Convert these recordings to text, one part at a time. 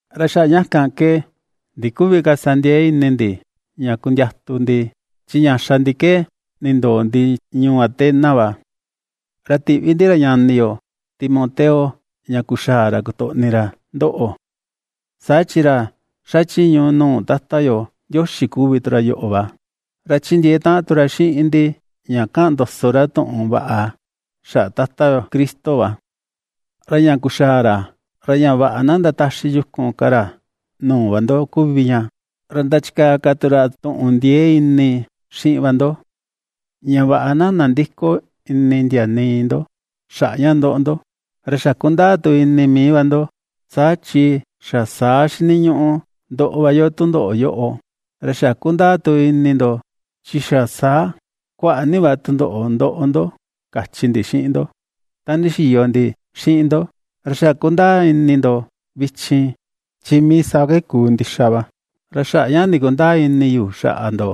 Ra xaꞌa ña kan ke ndiküvi ka sa ndiee ini ndi ña kundiatu ndi, chi ña xa ndi ke nindoo ndi ñuu Atenas va. Ra ti̱ꞌvi ndi ra ñani yo Timoteo, ña kuxaa ra kotoꞌni ra ndoꞌo, saa chi ra ^xachiñu nuu Tata yo Ndioxi kuvi tu ra yoꞌo va, ra ^chindiee taꞌan tu ra xiꞌin ndi ña ^kaꞌan ndoso ra tuꞌun vaꞌa xaꞌa Tata yo Cristo va, ra ña kuxaa ra, ra ña vaꞌa na ndataxi yukun ka ra nuu va ndo kuvi ña, ra ndachikaa ka tu ra tuꞌun ndiee ini xiꞌin va ndo, ña vaꞌa na nandïko ini ndia nii ndo xaꞌa ña ^ndoꞌo ndo. Ra xa kundaa tu ini mii va ndo, saa chi xa saa xiniñuꞌu ndoꞌo va yo tundoꞌo yoꞌo. Ra xa kundaa tu ini ndo, chi xa saa kuaꞌa ni va tundoꞌo ndoꞌo ndo, kachi ndi xiꞌin ndo ta ndixiyo ndi xiꞌin ndo, ra xa kundaa ini ndo vichin, chi mii saa ke kuu ndixa va. Ra xaꞌa ña ndikundäa ini yu xaꞌa ndo,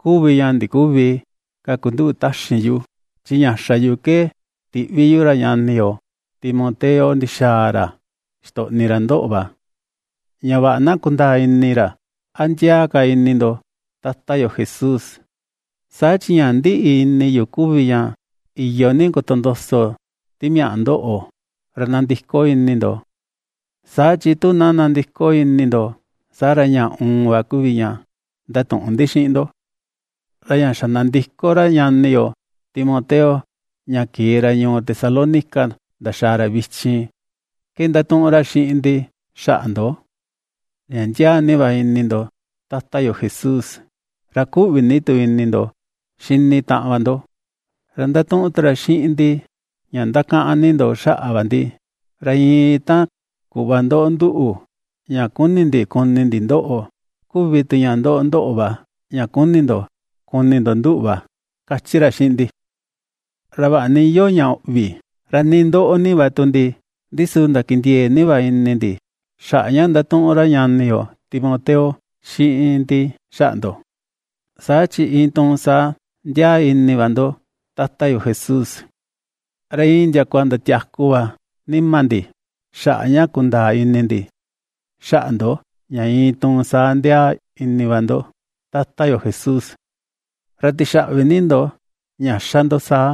kuvi ña ndiküvi ka kunduꞌu taxin yu, chi ña xa yu ke tiꞌvi yu ra ñani yo Timoteo ndixaa ra xitoꞌni ra ndoꞌo va, ña vaꞌa na kundaa ini ra, a ndiaa ka ini ndo Tata yo Jesús, saa chi ña ^ndiꞌi ini yu kuvi ña iyo ni kotondoso Timiaꞌa ndoꞌo, ra nandiko ini ndo, saa chi tu na nandiko ini ndo, saa ra ña uun va kuvi ña ndatuꞌun ndi xiꞌin ndo. Ra ña xa nandiko ra ñani yo Timoteo ña kee ra ñuu Tesalónica ndaxaa ra vichin, ke ^ndatuꞌun ra xiꞌin ndi xaꞌa ndo, ña ndiaa ni va ini ndo Tata yo Jesús, ra kuꞌvi ni tu ini ndo xini taꞌan va ndo. Ra ^ndatuꞌun tu ra xiꞌin ndi ña ndakaꞌan ni ndo xaꞌa va ndi, ra iin ta kuꞌva ^ndoꞌo nduꞌu, ña ^kuni ndi kuni ndi ndoꞌo kuvi tu ña ^ndoꞌo ndóꞌo̱ va, ña kuni ndo kuni ndo nduꞌu va, ^kachi ra xiꞌin ndi. Ra vaꞌa ni iyoo ña uꞌvi, ra nii ^ndoꞌo ni va tu ndi, ndi su ndakindiee ni va ini ndi xaꞌa ña ^ndatuꞌun ra ñani yo Timoteo xiꞌin ndi xaꞌa ndo, saa chi iin tuun saa ndiaa ini va ndo Tata yo Jesús. Ra iin ndiakua ndatiaku va nima ndi xaꞌa ña kundaa ini ndi, xaꞌa ndo ña iin tuun saa ndiaa ini va ndo Tata yo Jesús. ¡Ra tixaꞌvi ni ndo ña ^xa ndo saa,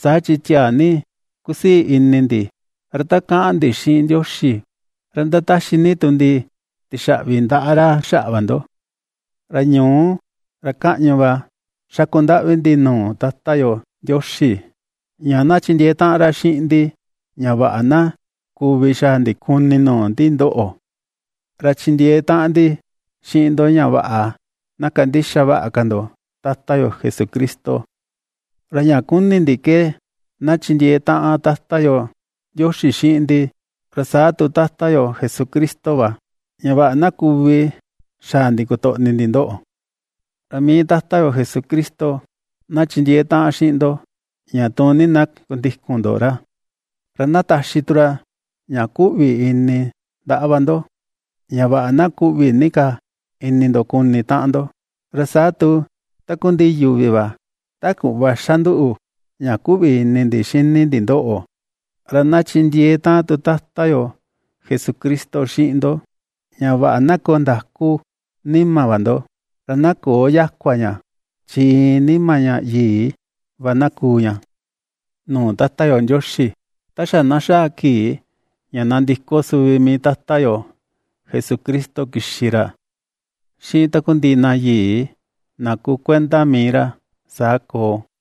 saa chi tiaa ni kusii ini ndi, ra ta kaꞌan ndi xiꞌin Ndioxi, ra ^ndataxi ni tu ndi tixaꞌvi ndaꞌa ra xaꞌa va ndo! Ra ñuú, ra kaꞌñu va xaku ndaꞌvi ndi nuu Tata yo Ndioxi, ña na chindiee taꞌan ra xiꞌin ndi ña vaꞌa na kuvi xaa ndi kuni nuu ndi ndoꞌo, ra chindiee taꞌan ndi xiꞌin ndo ña vaꞌa na kandixa vaꞌa ka ndo Tata yo Jesucristo. Ra ña kuni ndi ke na chindiee taꞌan Tata yo Ndioxi xiꞌin ndi, ra saa tu Tata yo Jesucristo va, ña vaꞌa na kuvi xaa ndi kotoꞌni ndi ndoꞌo. Ra mii Tata yo Jesucristo na chindiee taꞌan xiꞌin ndo ña tuun ni na kundikun ndo ra, ra na taxi tu ra ña kuꞌvi ini ndaꞌa va ndo, ña vaꞌa na kuꞌvi ni ka ini ndo kuni taꞌan ndo, ra saa tu takundiꞌi yuvi va, ta kuꞌva ^xa nduꞌu ña kuꞌvi ini ndi xini ndi ndoꞌo. Ra na chindiee taꞌan tu Tata yo Jesucristo xiꞌin ndo ña vaꞌa na koo ndakú nima va ndo, ra na köo yakua ña, chi iin nima ña yii va na kuu ña nuu Tata yo Ndioxi, ta xa na xaa kii ña nandiko suvi mii Tata yo Jesucristo kixi ra xiꞌin takundiꞌi na yii na kuu kuenda mii ra. Saa koo.